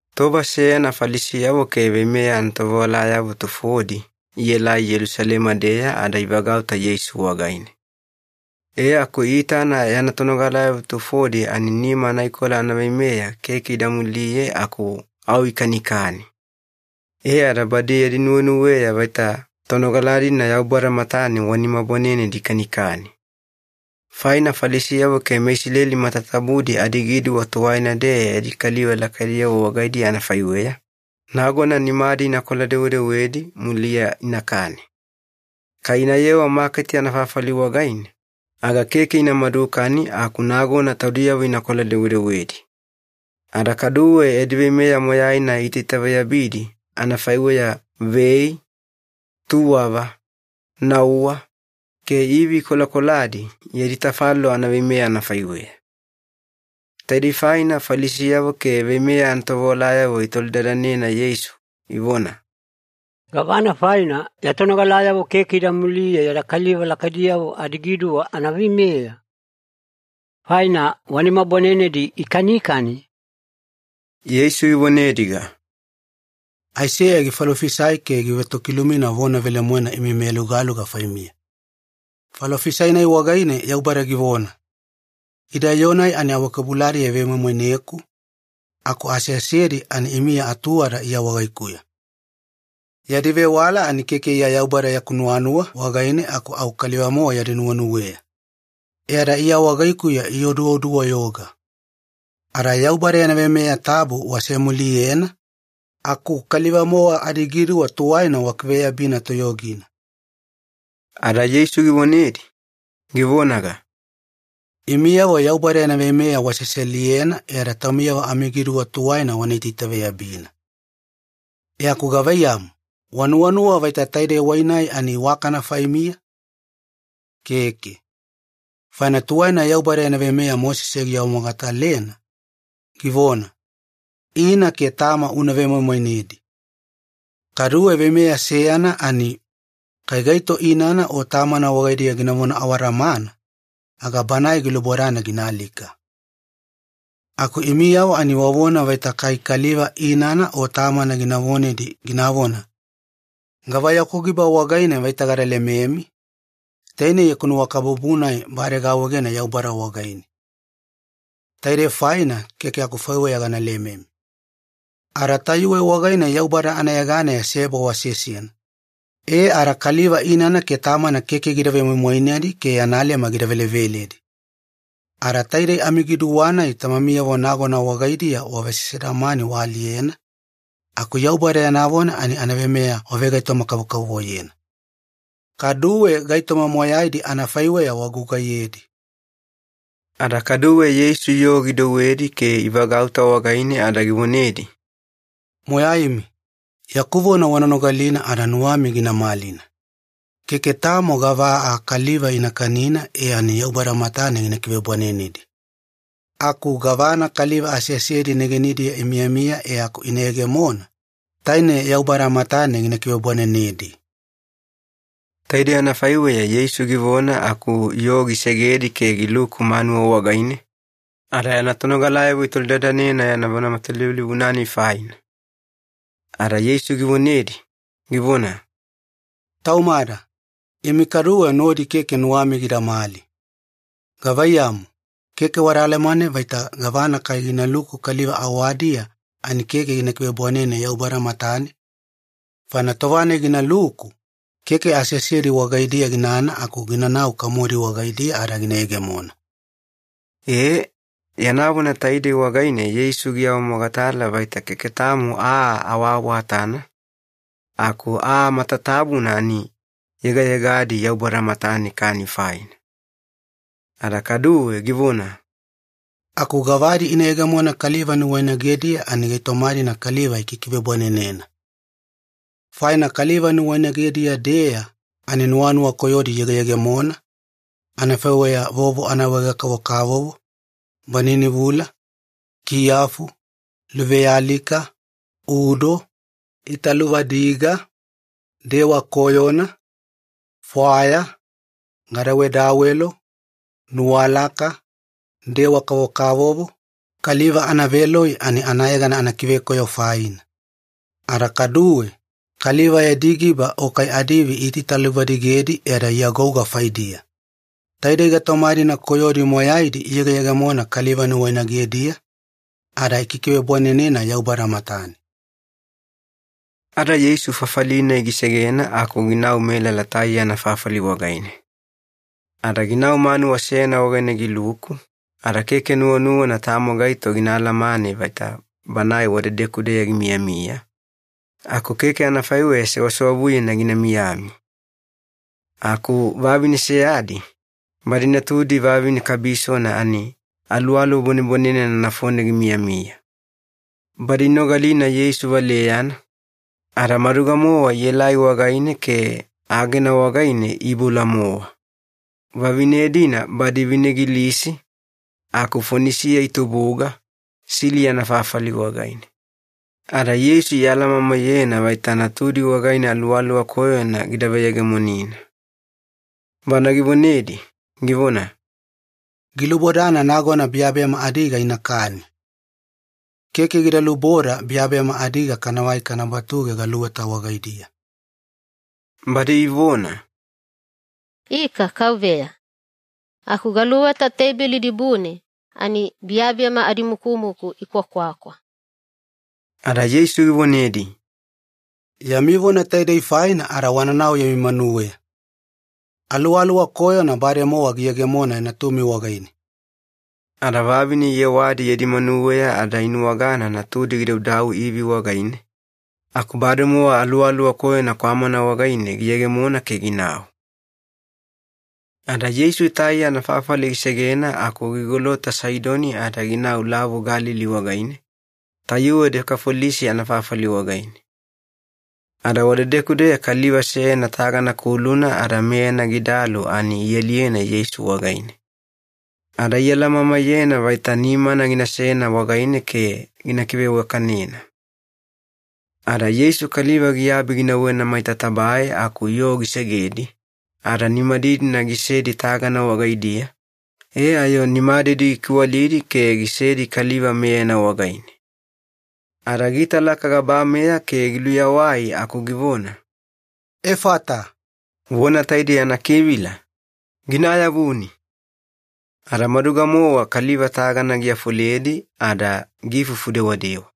Tova seyana Falisiyavo ke veimeya anatovewalayavo tufodi ielai Yelusalema-deya ada ivagauta Yeisu wagaine. E aku iitana yana tonogalayavo tufodi ani nima anaikola anaveimeya keke ida muliye aku au ikanikani. E ada badi yadi nuwenuweya vaita tonogala-dina Yaubada matane wa nima bwanenedi ikanikani. Faina Falisiyavo ke meIsileli matatabudi adigiduwa tuwaina-deya yadi kaliva lakaidiyavo wagaidiya anafaiweya, nagona nimadi inakola-dewedewedi, muliya inakani. Kai inayewa maketi anafafali wagaine, aga keke ina madukani aku nagona taudiyavo inakola-dewedewedi. Ada kaduwe yadi veimeya moyaina iitaitaveyabidi, anafaiweya vei, tuwava, nauwa, ke ivi ikolakoladi yadi tafalolo anaveimeya anafaiweya. Taidei faina Falisiyavo ke veimeya anatovewalayavo itolidadanena Yeisu, ivona, “Gavana faina ya tonogalayavo keke ida muliye yada kaliva lakaidiyavo adigiduwa anaveimeya? Faina wa nima bwanenedi ikanikani.” Yeisu givonediga, “Aiseya gifalofisai ke givetokilumina vona velemoena imi meyalugaluga faimiya. Falofisai-nai wagaine Yaubada givona, ‘Ida yoo-nai ani awakebuladiya ivemoimoineku, aku aseasedi ani imiya atuwada Iya wagaikuya. Yadi vewala ani keke Iya Yaubada yaku nuwanuwa wagaine aku au kaliva-mowa yadi nuwenuweya. E ada Iya wagaikuya ioduodu-wayoga.’ Ada Yaubada yana veimeya tabu wasemuliyena, aku kaliva-mowa adigiduwa tuwaina wakiveyabina toyogina.” Ada Yeisu givonedi, givonaga, “Imiyavo Yaubada yana veimeya waseseliyena e ada taumiyavo amigiduwa tuwaina wana itaitaveyabina. E aku gavaiyamu, wanuwanuwa vaita taide wai-nai ani iwakana faimiya? Keke. Faina tuwaina Yaubada yana veimeya Mosese giawamogatalena, givona, ‘Ina ke tama una vemoimoinedi.’ Kaduwe veimeya seyana ani, ‘Kai gaito inana o tamana wagaidiya ginavona awadamana, aga banae gilubodana gina alika.’ Aku imiyavo ani wavona vaita kai kaliva inana o tamana gina vonedi ginavona, ‘Gava yaku giba wagaine vaita gada lememi, taine yaku nuwakabubu-nai bade gaawaegena Yaubada wagaine. Taide faina keke akufaiweya gana lememi.’ Ada tayuwe wagaine Yaubada anayeganeya seba wasesena, e ada kaliva inana ke tamana keke gida vemoimoinedi ke yana leme gida veleveledi. Ada taidei amigiduwa-nai tamamiyavo nagona wagaidiya wavesesedamani waaliyena, aku Yaubada yana vona ani anaveimeya wavegaitoma-kavokavovoyena. Kaduwe gaitoma moyaidi anafaiweya wagugaiyedi.” Ada kaduwe Yeisu yoo gidouwedi ke ivagauta wagaine ada givonedi, “Moyaimi, yaku vona wana nogalina ada nuwami gina malina. Keke tamo gava aa kaliva ina kanina e ani Yaubada matane gina kivebwanenedi. Aku gavana kaliva aseasedi negenidiya imiyamiya e aku ina yegemona, taine Yaubada matane gina kivebwanenedi.” Taidei anafaiweya Yeisu givona aku yoo gisegedi ke giluku manuwa wagaine, ada yana tonogalayavo itolidadanena yana vona matalivulivuna-nai faina. Ada Yeisu givonedi, givona, “Taumada, imi kaduwe nodi keke nuwami gidamali. Gavaiyamu, keke wada alamane vaita gavana kai ginaluku kaliva awadiya ani keke gina kivebwanene Yaubada matane? Faina tova-nai ginaluku, keke aseasedi wagaidiya ginana aku ginanau kamodi wagaidiya ada gina yegemona.” Ee, yana vona taidei wagaine Yeisu giawamogatala vaita keke tamo aa awaawatana, aku aa matatabuna ani yegayegadi Yaubada matane kani faina. Ada kaduwe givona, “Aku gavadi ina yegemona kaliva nuwainagediya ani gaitoma-dina kaliva ikikivebwanenena. Faina kaliva nuwainagediya-deya ani nuwanuwa koyodi iyegeyegemona, anafaiweya vovo anaawaege-kavokavovo, baninivula, kiyafu, luvealika, udo, italuvadiga, dewa koyona, fwaya, gadawedawelo, nuwalaka, dewa kavokavovo, kaliva anaveloi ani anayegana anakivekoyo faina. Ada kaduwe, kaliva yadi giba o kai adiivi iitaitaluvadigedi e ada iagouga faidiya. Taidei gaitoma-dina koyodi moyaidi iyegeyegemona kaliva nuwainagediya, ada ikikivebwanenena Yaubada matane.” Ada Yeisu fafali-nai gisegena aku ginau melala Taiya anafafali wagaine. Ada ginau manuwa seyana wagaine giluku, ada keke nuwanuwana tamo gaito gina alamane vaita Banae wadedeku-deya gimiyamiya, aku keke anafaiweya sewasewavuyena gina miyami. Aku vavine seyadi, badi natudi vavine kabisona ani aluwaluwa bwanebwanenena nafone gimiyamiya. Badi inogalina Yeisu valeyana, ada maduga-mowa ielai wagaine ke agena wagaine iiboula-mowa. Vavine-dina badi vine Gilisi, aku Fonisiya itubuga, Siliya anafafali wagaine. Ada Yeisu ialamamaiyena vaita natudi wagaine aluwaluwa koyona gida veyegemonina. Bana givonedi, givona, “Gilubodana nagona biyabiyama adiga inakani. Keke gida luboda biyabiyama adiga kanavai kana batuge galuweta wagaidiya.” Badi ivona, “Ika, Kauveya. Aku galuweta teibeli dibune ani biyabiyama adimukumuku ikwakwakwa.” Ada Yeisu givonedi, “Yami vona taidei faina ada wananau yami manuweya. Aluwaluwa koyona bademowa giyegemona natumi wagaine.” Ada vavine iyewadi yadi manuweya ada inuwagana natudi gidaudau ivi wagaine, aku bademowa aluwaluwa koyona kwamana wagaine giyegemona ke ginau. Ada Yeisu Taiya anafafali gisegena aku gigolota Saidoni ada ginau Lavu Galili wagaine, tayuwe Dekafolisi anafafali wagaine. Ada wadedeku-deya kaliva seyana tagana kuluna ada meyana gidalu ani ialiyena Yeisu wagaine. Ada ialamamaiyena vaita nimana ginasena wagaine ke gina kiveiwakanena. Ada Yeisu kaliva giabi ginauwena maita tabae aku yoo gisegedi, ada nimadidina gisedi tagana wagaidiya e ayo nimadidi gikiwalidi ke gisedi kaliva meyana wagaine. Ada giitalaka gabameya ke giluyawai aku givona, “Efata!” Vona taidei anakivila, ‘Gina ayavuni!’ Ada maduga-mowa kaliva tagana giafoledi ada giifufu dewadewa.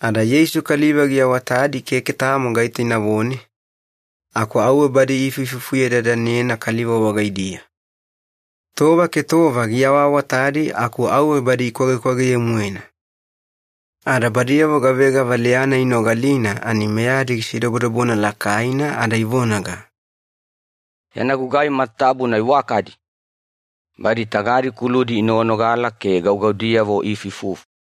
Ada Yeisu kaliva giawatadi keke tamo gaito inavone, aku auwe badi iifuifufuyedadanena kaliva wagaidiya. Tova ke tova giawaawatadi aku auwe badi ikwagekwageye-moena. Ada badiyavo gavega valeya-nai inogalina ani meyadi gisidobodobona lakaina ada ivonaga, “Yana gugai matatabuna iwakadi! Badi tagadi kuludi inoganogala ke gaugaudiyavo iifuifufu!”